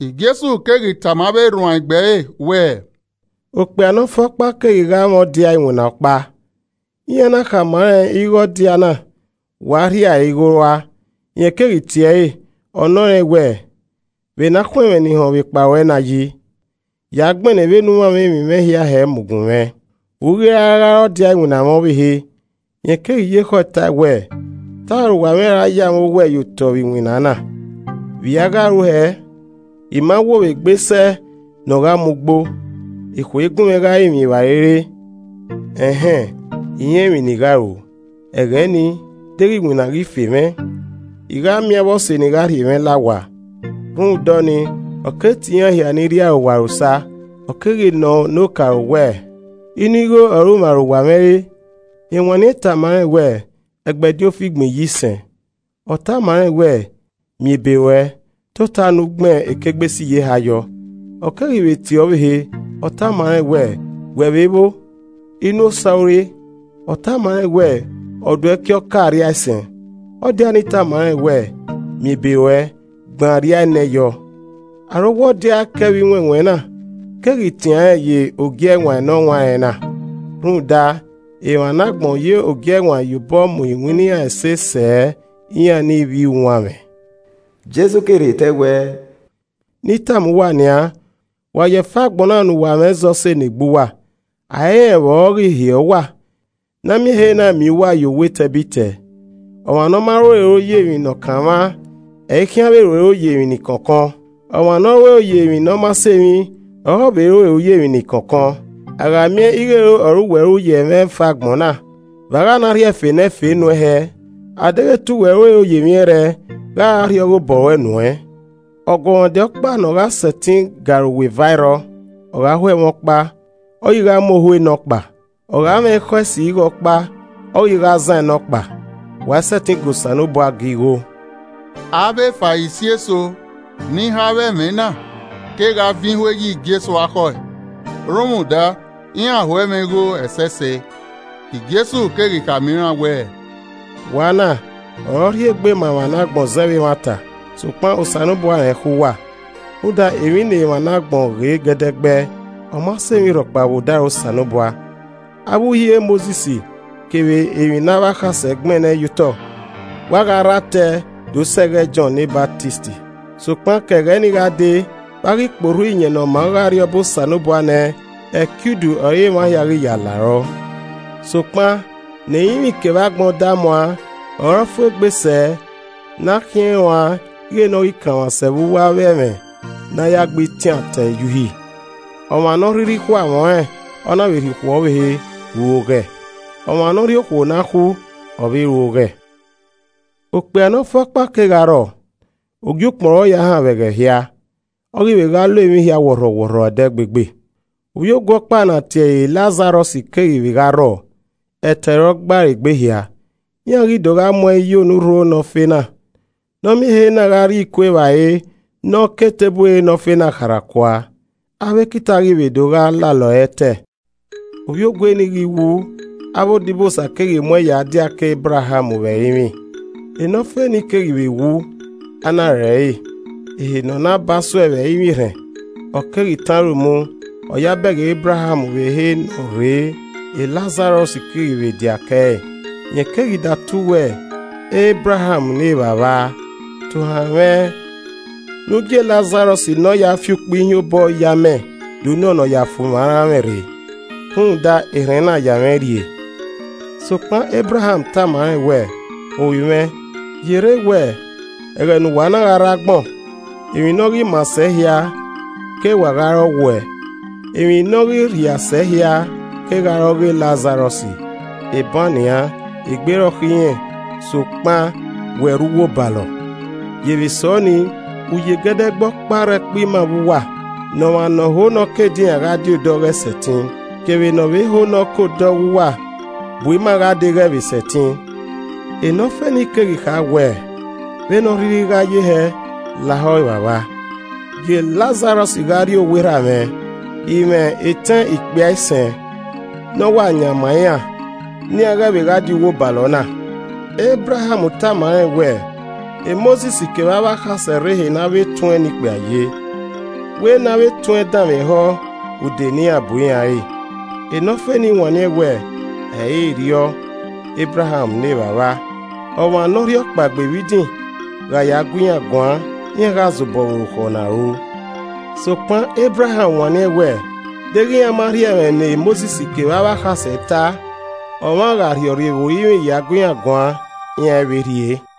Jesu keghi tama avbe erhuanegbe ẹre wẹẹ, “Okpia ne ọ fe ọkpa keghi gha mwẹ ọdia iwinna ọkpa, iran na khama rẹn ighẹ ọdia na wa rhia ẹre igho rua. Rẹn keghi tie ẹre, ọ nọ rẹn wẹẹ, ‘Vbe ena khun ẹmwẹ ne I họn vbe kpa ruẹ na yi? Ya gbẹnnẹ vbe ne u mwamwa emwi mwẹ hia hẹ mu gunmwẹ, u i ghi ra gha re ọdia iwinna mwẹ ọvbehe.’ Rẹn keghi ye ekhọe tae wẹẹ, ‘Te arowa mwẹ ra ya mwẹ owẹ ye otọ vbe iwina na, vbe i a gha ru hẹẹ? I ma wo vbe gbe sẹ ne ọ gha mu ugbo, ekhue i gunmwẹ gha rinmwian evbare re. Ẹnhẹn, I rẹn emwi ne I gha ru. Ẹghẹ nii, deghẹ iwinna ghi fe mwẹ, I gha miẹn avbe ọse ni gha rhie mwẹ la owa.’ Rhunmwuda ọnii, ọ keghi tie iran hia ni rri arowa ẹre osa. Ọ keghi nọ ne okaro wẹẹ, ‘Inu igho ọre u mwẹ arowa mwẹ re?’ Rẹn wanniẹn tama rẹn wẹ, ‘Ẹgbẹdin ofigbọn iyisẹn.’ Ọ tama rẹn wẹẹ, ‘Miẹn ebe ruẹ, tota ne u gbẹn ekigbesiyeha yọ.’ Ọ keghi vbe tie ọvbehe, ọ tama rẹn wẹẹ, ‘Wẹ vbe vbo, inu osa u re?’ Ọ tama rẹn wẹ, ‘Ọduẹki ọka arriaisẹn.’ Ọdia ni tama rẹn wẹẹ, ‘Miẹn ebe ruẹ, gbẹn arriaenẹ yọ.’ Arowa ọdia ẹkẹ vbe iwẹnwẹn na keghi tian rẹn ye ogie ẹwaẹn ne ọ wan rẹn na rhunmwuda, emwa ne agbọn ye ogiẹwaẹn ye obọ mu iwinna iran ẹse sẹ iran ne ivbi uwanmwẹ.” Jesu keghi rhie te ẹe wẹẹ, “Ne I tama uwa nian, wa ye ẹfe agbọn na ne uwa mwẹ zẹ ọse ne egbe uwa, a i rẹn vbe ọ gha ghi hiẹ uwa, ne a miẹn ehe na miẹn uwa ye owa etẹbitẹ. Ọmwa ne ọ ma ru ero ye emwi ne ọ kanmwa, ọre ẹ i khian vbe ru ero ye emwi ni kọnkọn, ọmwa ne ọ ru ero ye emwi ne ọ ma sẹ emwi, ọre ọ vbe ru ero ye emwi ni kọnkọn. A gha miẹn ighẹ ero ọre uwẹ ru ye ẹmwẹ ẹfe agbọn na, vbe a gha na rhie ẹfe ne ẹfe nuẹn hẹẹ? A deghẹ te uwẹ ru ero ye emwi ẹrrẹe, gha ọ ra rhie ọghe obọ ruẹ nuẹn? “Ọguọmwadia ọkpa ne ọ gha sẹtin ga arowa eva ẹ i rrọọ, ọ gha ho ẹmwẹ ọkpa ọ ghi gha mu ohu enọkpa, ọ gha mwẹ ekhọe esi ghe ọkpa ọ ghi gha zan nọkpa. Wa i sẹtin ga Osanobua ga igho.” Avbe Farisi eso ni họn avbe ẹmwẹ na kegha vin ihue ye Jesu akhọe, rhunmwuda iran ho ẹmwẹ igho ẹsẹse. Jesu keghi khama iran wẹẹ, “Wa na ọre ọ rhie egbe ma emwa ne agbọn zẹ vbe emwata, sokpan Osanobua rẹn ekhọe uwa. Rhunmwuda, emwi ne emwa ne agbọn ghe gẹdẹgbẹ, ọ ma sẹ emwi rhọkpa vbe odaro Osanobua. “Avbe Uhi e Mosis kevbe emwi ne avbe akhasẹ gbẹnnẹ ye otọ wa gha rre atẹ do sẹ ẹghẹ e Jọn ne Ọsamẹ. Sokpan ke ẹghẹ nii gha dee, vbe a ghi kpe orhu Iyẹn Ne ọ maa ọghe Arriọba Osanobua nẹ, ẹki udu ọre emwa hia ghi ya larọ. Sokpan ne ẹrinmwi kevbe agbọn da muaan, ọre ọ fu egbe sẹ ne a khiẹn ruan ighe ne ọ ghi kanmwa sẹ vbe uwu avbe ẹmwẹ ne a ya gbe itian atẹ ye Uhi. “Ọmwa ne ọ rhirhi khu amwẹ ọnrẹn, ọna vbe rhie okhuo ọvbehe, ru oghẹ, ọmwa ne ọ rhie okhuo ne a khu, ọ vbe ru oghẹ. “Okpia ne ọ fe ọkpa kegha rrọọ, ogiukpọn ọre ọ ya haan vbe ẹghẹ hia, ọ ghi vbe gha lo emwi hia wọrhọwọrhọ ẹdẹgbegbe. Ovbiogue ọkpa ne a tie ẹre Lazarọs keghi vbe gha rrọọ, ẹtẹ ọre ọ gba ẹre egbe hia, iran ghi do gha mu ẹn ye onurho enọfe na. Nẹ ọ miẹn ehe na gha rri iku evbare ne ọ ke eteburu enọfe na kharha kua. Avbe ekita ghi vbe do gha lalọ ẹre ẹtẹ. Ovbiogue nii ghi wu, avbe odibosa keghi mu ẹn ya diake Ebraham vbe ẹrinmwi. Enọfe ni keghi vbe wu, a na re ẹre. Ehe ne ọ na ba suẹe vbe Ẹrinmwi erhẹn, ọ keghi tọn aro mu, ọ ya bẹghe Ebraham vbe ehe ne ọ rrei, Lazarọs keghi vbe dia kẹe. Rẹn keghi datu wẹẹ, ‘Ebraham ne Evbavba! Tohan mwẹ ne u gie Lazarọs ne ọ ya fi ukpẹ ihiẹn obọ ye amẹ do nọnọ ya fu mwẹ aranmwẹ rre, rhunmwuda erhẹn na ya mwẹ rrie!’ Sokpan Ebraham tama rẹn wẹẹ, ‘Ovbi mwẹ, yerre wẹẹ, ẹghẹ ne uwa na rre agbọn, emwi ne ọ ghi maa sẹ hia ke wa gha re ọ wuẹ, emwi ne ọ ghi rhia sẹ hia kegha re ọghe Lazarọs, eban nian, egbe rọkhọ irẹn sokpan wẹ rre uwu obalọ. Yevbe sẹ ọnii, uye gẹdẹgbẹ ọkpa rre ẹkpo ima vbe uwa, ne ọmwa ne ọ ho nọ ke edinran gha die odọọ, ghẹ sẹtin, kevbe ne ọ vbe ho ne ọ ke odọọ ọghe uwa bu ima gha dee ghẹ vbe sẹtin.’ Enọfe ni keghi kha wẹ, ‘Vbene ọ rhirhi gha ye hẹ, lahọ, evbavba, gie Lazarọs gha rrie owa erha mwẹ. I mwẹ etẹn ikpia isẹn, ne ọ wa yan ma iran ne iran ghẹ vbe gha di uwu obalọ na.’ Ebraham tama rẹn wẹẹ, ‘Mosis kevbe avbe akhasẹ rre ehe ne avbe etuẹn ne ikpia ye, wẹ ne avbe etuẹn danmwehọ ude ne iran bu iran re.’ Enọfe nii wanniẹn wẹẹ, ‘Ẹ i re erriọ, Ebraham ne evbavba, ọmwa ne ọ rhiọkpaegbe vbe idin gha ya gu iran guan, iran gha zobọ vbe orukhọ ne a ru.’ Sokpan Ebraham wanniẹn wẹẹ, ‘Deghẹ iran ma rhie ẹmwẹ ne Mosis kevbe avbe akhasẹ ta, ọmwa gha rhe rhiọrre vbe orinmwi ya gu iran guan, iran i vbe rhie.’”